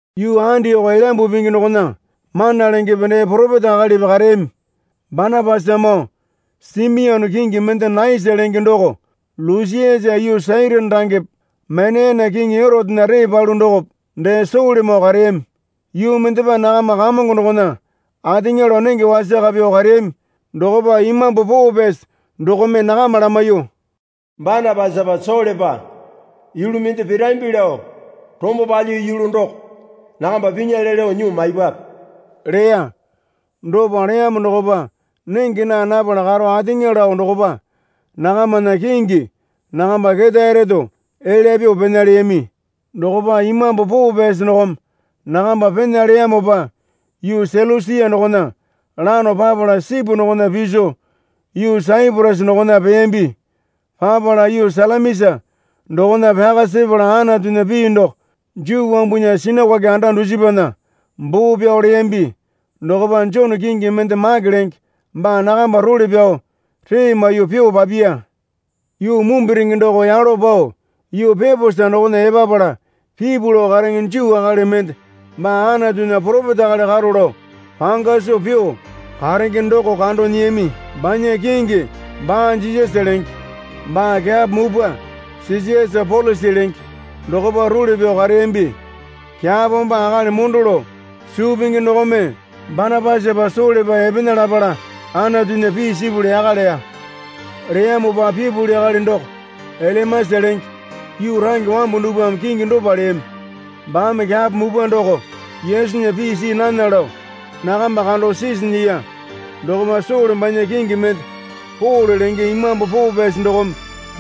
Yuu Andioko Elyambu Pingi dokona mana lengepe dee poropeta akalipi kareyami. Banapasamoo Simione kingi mende Naisa lenge doko, Lusiasa yuu Sairini rangepe Maneyene kiŋi Erotena ree palu dokope dee Solemoo kareyami. Yuu mendepa nakama Kamongo dokona ateŋa lao nenge wasaka pyuo kareyami dokopa Imambu Poo Pyasi dokome nakama lamaiyuo, Banapasapa Solepa yulu mende pirambi lao rombo palyiyu yulu doko nakamba pinyale lao nyuo maipwape leya. Dopa leyamo dokopa nenge naa napala karo ateŋa lao dokopa nakamana kingi nakamba ketae reto elya pyuo pena leyami. Dokopa Imambu Poo Pyasi dokome nakamba pena leyamopa yuu Selusia dokona lano papala sipu dokona piso yuu Saiporasa dokona peyambi. Papala yuu Salamisa dokona pyaka sepala Anatunya pii doko Juu wambunya sinakoke anda dusipana baa pyao leyambi. Dokopa Jone kingi mende Make lenge baa nakamba role pyao ree maiyuo pyuo papiya. Yuu mumbirenge doko yalo pao yuu Peposa dokona epapala pipu lao karenge Juu akali mende baa Anatunya poropeta akali karo lao panga soo pyuo karenge doko kando nyiyami. Banya kingi Ba-Jisasa lenge. Baa kyapo mupwa Sesiasa Polusi lenge dokopa role pyao kareyambi. Kyapo baa akali mondo lao suu pingi dokome Banapasapa Solepa epena lapala Anatunya pii sipuli yaka leya. Leyamopa pipuli akali doko Elimasa lenge (yuu range wambu dupwame kingi dopa leyami) baame kyapo mupwa doko Yesunya pii see nana lao nakamba kando sisi nyiya. Dokopa Sole banya kingi mende Pole lenge Imambu Poo Pyasi dokome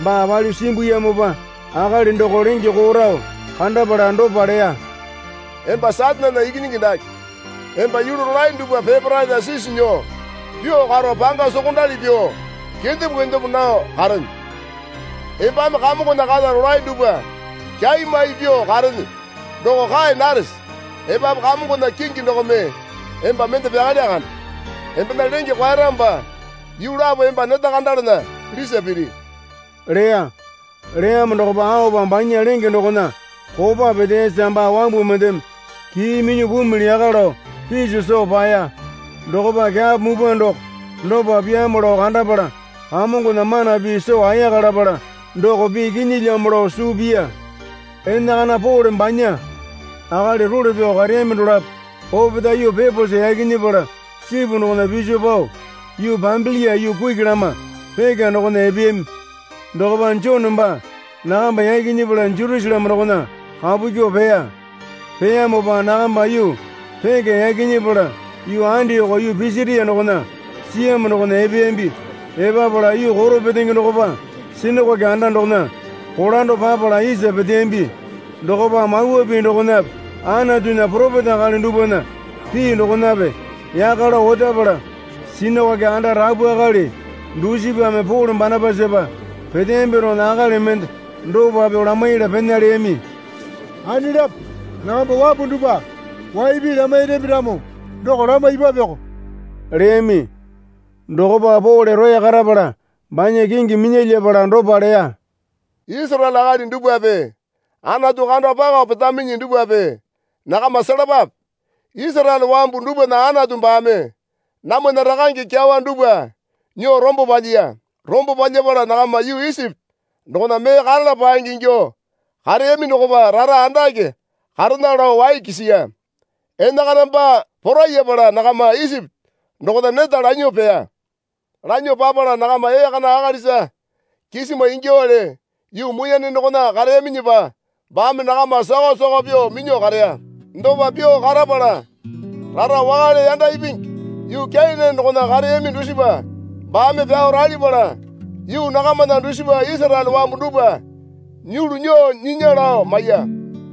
baa palyuo simbuyamopa akali doko lenge koo rao kandapala dopa leya. Emba Satanena ikinyingi dake, emba yulu rolae dupwa peparaena sisi nyuo pyuo karo panga sokondali pyuo kendepo kendepo nao karene. Embame Kamongona kata rolae dupwa kyaimai pyuo karene doko kae narese? Epapu Kamongona kingi dokome emba mende pyakalya kande. Embena lenge kwaeramopa yuu lapo emba neta kandalana lisa piri leya. Leyamo dokopa aopa banya lenge dokona kopa peteyasa baa wambu mendeme kii minyuo pumili yaka lao piso soo paeya. Dokopa kyapo mupwa doko dopa pyaamo lao kandapala Kamongona mana pii soo ayaka lapala doko pii kinyilyamo lao suu piya. Enakana Pole banya akali role pyao kareyami dolapo opetae yuu Peposa yaki nyepala sipu dokona piso pao yuu Pambilia yuu kuki lama Peka dokona epeyami. Dokopa Jone baa nakamba yaki nyepala Jerusaleme dokona kapu kyuo peya. Peyamopa nakamba yuu Peka yaki nyepala yuu Andioko yuu Pisitia dokona siyamo dokona epeyambi. Epapala yuu koro petenge dokopa sinakoke anda dokona kolando papala isa peteyambi. Dokopa Mawa Pii dokonape Anatunya poropeta akali dupwana pii dokonape yaka lao otapala sinakoke anda rapu akali dusipame Pole Banapasapa peteyambi dokona akali mende dopa pyuo lamaiyala pena leyami. Anelapo nakamba wambu dupwa wai pii lamairambi ramo doko lamaipwapeko leyami. Dokopa Pole roya karapala banya kingi minya yapala dopa leya. Isaraele akali dupwape Anatu kando pakao petaminyi dupwape nakama selapape. Isaraele wambu dupwana Anatu baame namwana rakange kyawa dupwa nyuo rombo palyiya. Rombo palyapala nakama yuu Isipi dokona mee karala paenge ingyuo kareyami dokopa rara andake karena lao wai kisiya. Enakana baa porayapala nakama Isipi dokona neta lanyuo peya. Lanyuo papala nakama ee kana akalisa kisima ingyuowale yuu muiyane dokona kareyaminyipa baame nakama sakao sakao pyuo minyuo kareya. Dopa pyuo karapala rara wakale yanda ipingi yuu Kenane dokona kareyami dusipa baame pyao ralipala yuu nakamana dusipa Isaraele wambu dupwa nyulu nyuo nyinya lao maiya.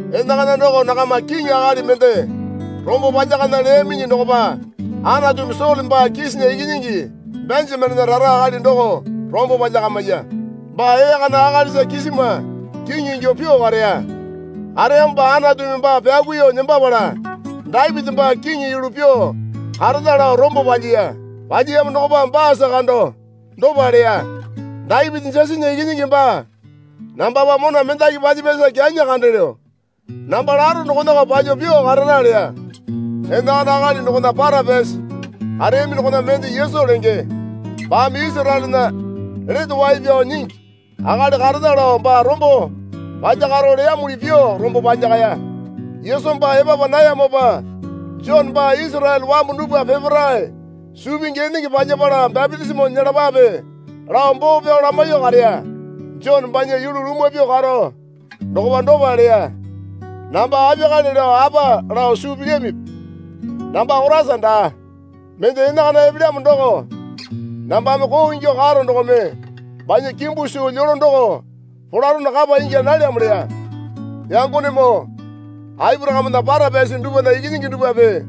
Enakana doko nakama kiŋi akali mende rombo palyakana leyaminyi dokopa Anatumi Sole baa Kisana ikinyingi Benjamenena rara akali doko rombo palyakamiya. Baa ee kana akalisa kisima kiŋi ingyuo pyuo kareya. Kareyamopa Anatumi baa pyakuiyuo nembapala Dapiti baa kiŋi yulu pyuo karena lao rombo palyiya. Palyiyamo dokopa baasa kando dopa leya. Dapiti Jesena ikinyingi baa nambapa mona mendaki palyapyasa kyanyi kandelyo. Namba laro dokonako palyuo pyuo karara leya. Enakana akali dokona para pyasi kareyami dokona mende Yesu lenge baame Isaraelena Lete Wai Pyao Nyingi akali karena lao baa rombo palyakaro leyamuli pyuo rombo palyakaya. Yesu baa epapa nayamopa Jone baa Isaraele wambu dupwa peparae suu pingi enenge palyapala bapitisimo nyelapape, lao boo pyao lamaiyuo kareya. Jone banya yulu lumwa pyuo karo dokopa dopa leya. Namba apiyakale lao apa lao suu pilyamipi? Namba Koraisa daa. Mende enakana epelyamo doko nambame koo ingyuo karo dokome banya kimbu suu lyolo doko polarono kapa ingya nalyamo leya. Yangonemoo, Aporakamena para pyasi dupwana ikinyingi dupwape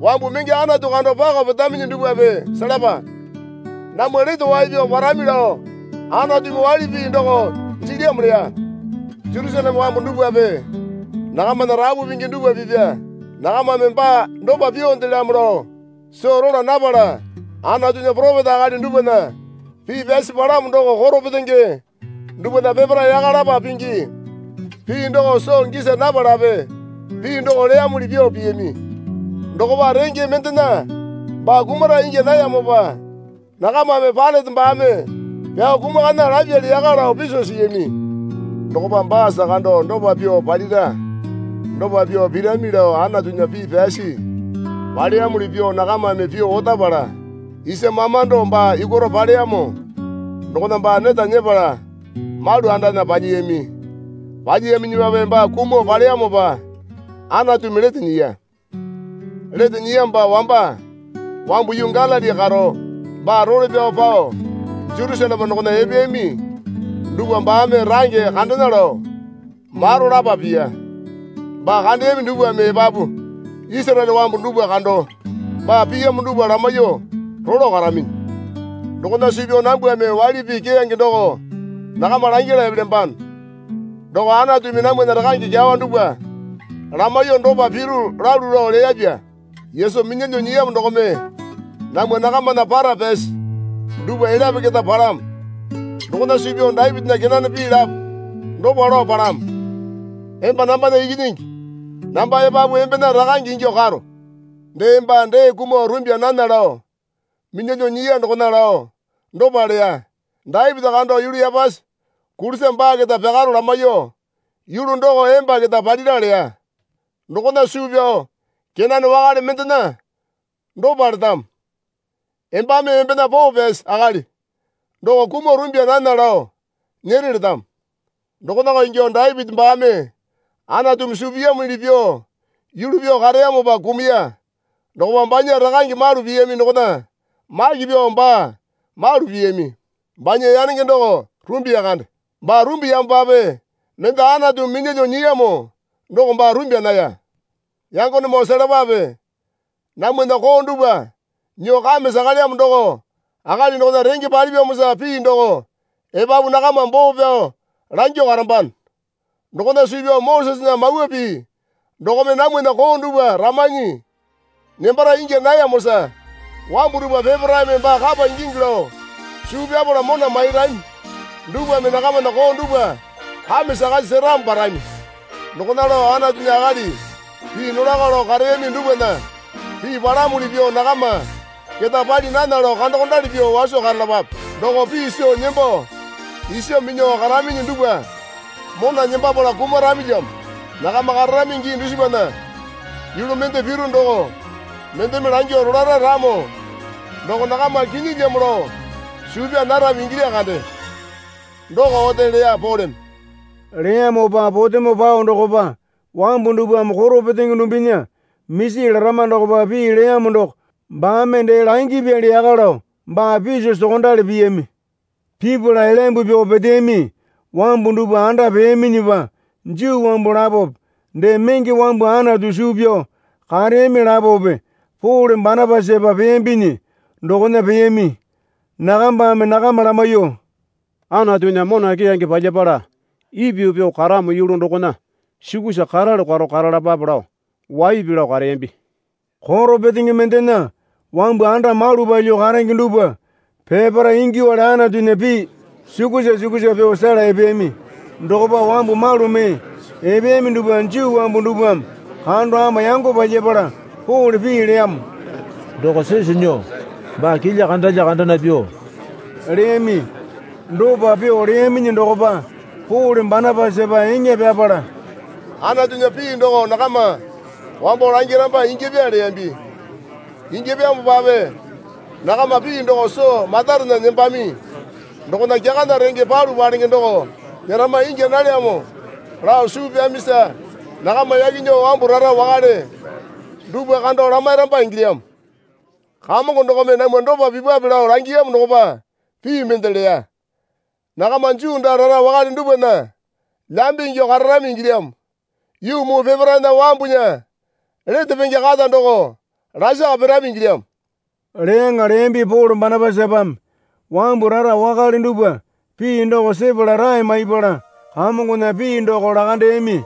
wambu menge Anatu kando pakao petaminyi dupwape selapa. Namwa lete wai pyao parami lao Anatumi waili pii doko jilyamo leya. Jerusaleme wambu dupwape nakamana rapu pingi dupwa pipya nakamame baa dopa pyuondelyamo lao soo rola napala Anatunya poropeta akali dupwana pii pyasi palamo doko koro petenge dupwana peparae yaka lapa pingi pii doko soo gisa napalape pii doko leyamuli pyuo piyami. Dokopa renge mendena baa kumara ingya nayamopa nakamame Pailate baame pyao kumakana lapyali yaka lao piso siyami. Dokopa baasa kando dopa pyuo palira dopa pyuo pirami lao Anatunya pii pyasi paleyamuli pyuo nakamame pyuo otapala isa mamando baa yukwaro paleyamo dokona baa neta nyepala malu andana palyiyami. Palyiyaminyipape baa kumuo paleyamopa Anatumi lete nyiya. Lete nyiyamopa wamba wambu yuu Galili karo baa role pyao pao Jerusaleme dokona epeyami dupwa baame range kandena lao maro lapa piya. Baa kandeyami dupwame epapu Isaraele wambu dupwa kando baa piyamo dupwa lamaiyuo rolo karaminyi. Dokona suu pyao nambwame waili pii keyange doko nakama langyala epelyambano. Doko Anatumi namwana rakange kyawa dupwa lamaiyuo dopa piru lalu lao leyapya. Yesu minyalyuo nyiyamo dokome namwa nakamana para pyasi dupwa elyape keta palamo. Dokona suu pyao Dapitinya kenane pii lapo dopa lao palamo. Emba nambana Ikinyingi, namba epapu embena Rakange ingyuo karo. Dee baa dee kumuo rumbya nana lao minyalyuo nyiya dokona lao dopa leya. Dapiti kando yulu yapasi kulisa baa keta pyakaro lamaiyuo, yulu doko emba keta palira leya. Dokona suu pyao kenane wakale mendena dopa letamo. Embame embena poo pyasi akali doko kumuo rumbya nana lao nyere letamo. Dokonako ingyuo Dapiti baame Anatumi suu piyamuli pyuo yulu pyuo kareyamopa kumuya dokopa banya rakange malu piyami dokona maki pyuo baa malu piyami. Banya yanenge doko rumbiya kande. Baa rumbiyamopape mende Anatumi minyalyuo nyiyamo doko baa rumbya naya. Yangonemoo selapape. Namwana koo dupwa nyuo kame sakalyamo doko akali dokona renge palyiyamosa pii doko epapu nakama boo pyao langyuo karambano. Dokona suu pyao Mosesena Mawa Pii dokome namwana koo dupwa ramanyi nembara ingya nayamosa wambu dupwa peparaeme baa kapa ingingi lao suu pyapala mona mairami dupwame nakamana koo dupwa kame sakasi seramo parami. Dokona lao Anatunya akali pii nolako lao kareyami dupwana pii palamuli pyuo nakama keta pali nana lao kandokondali pyuo waso karalapape. Doko pii soo nembo isa minyuo karaminyi dupwa mona nembapala kumaramilyamo. Nakama kararami gii dusipana yulu mende piru doko mendeme langyuo rolara ramo doko nakama kinyilyamo lao suu pyaa narami ingilya kande. Doko ote leya Poleme. Leyamopa potemo pao dokopa wambu dupwame koro petenge dumbinya misi larama dokopa pii leyamo doko baame dee langipyali yaka lao baa piso sokondali piyami. Pipala elyambu pyuo peteyami wambu dupwa anda peyaminyipa Juu wambu lapope dee menge wambu Anatu suu pyao kareyami lapope Pole Banapasapa peyambinyi dokona peyami. Nakambame nakama lamaiyuo, Anatunya mona keyange palyapala ipyuo pyuo karamo yulu dokona sukusa karalu karo karalapape lao waipi lao kareyambi. Koro petenge mendena wambu anda malu palyuo karenge dupwa peparae ingyuowale Anatunya pii sukusa sukusa pyuo sela epeyami. Dokopa wambu malu mee epeyami dupwa Juu wambu dupwame kando ama yango palyapala Pole pii leyamo doko sisu nyuo baa kilya kandalya kandana pyuo leyami. Dopa pyuo leyaminyi dokopa Pole Banapasapa eŋa pyapala, Anatunya pii doko nakama wambo langiramba ingyapya leyambi. Ingyapyamopape nakama pii doko soo matarena nembami dokona kyakana renge palu palenge doko nyerama ingya nalyamo lao suu pyamisa nakama yaki nyuo wambu rara wakale dupwa kando lamairamba ingilyamo. Kamongo dokome namwa dopa pipwape lao langiyamo dokopa pii mende leya. Nakama Juu daa rara wakale dupwana lambe ingyuo kararami ingilyamo. Yuu muu peparaena wambunya lete penge kata doko lasaka pirami ingilyamo, leyaŋa leyambi Pole Banapasapame. Wambu rara wakale dupwa pii doko sepala rae maipala Kamongona pii doko lakandeyami.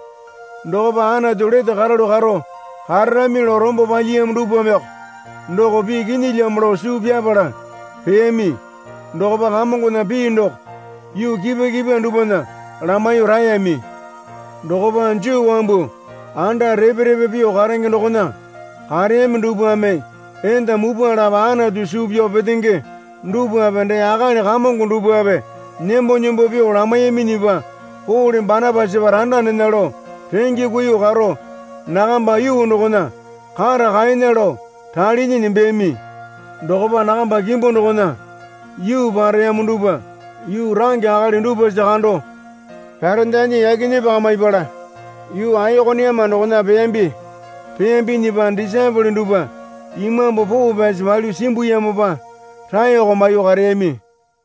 Dokopa Anatu lete karalu karo kararami lao rombo palyiyamo dupwameko doko pii kinyilyamo lao suu pyapala peyami. Dokopa Kamongona pii doko yuu kipwa kipwa dupwana lamaiyuo raeyami. Dokopa Juu wambu anda repe repe pyuo karenge dokona kareyami dupwame enda mupwa lapo Anatu suu pyao petenge dupwape dee akali kamongo dupwape nembo nembo pyuo lamaiyaminyipa Pole Banapasapa randa nena lao renge kuiyuo karo nakamba yuu dokona kata kaena lao ralinyi nembeyami. Dokopa nakamba kimbu dokona yuu pareyamo dupwa yuu range akali dupwasa kando pyarendanyi yaki nyepakamipala yuu Aikoniuma dokona peyambi. Peyambinyipa disaepole dupwa Imambu Poo Pyasi palyuo simbuyamopa raeko maiyuo kareyami.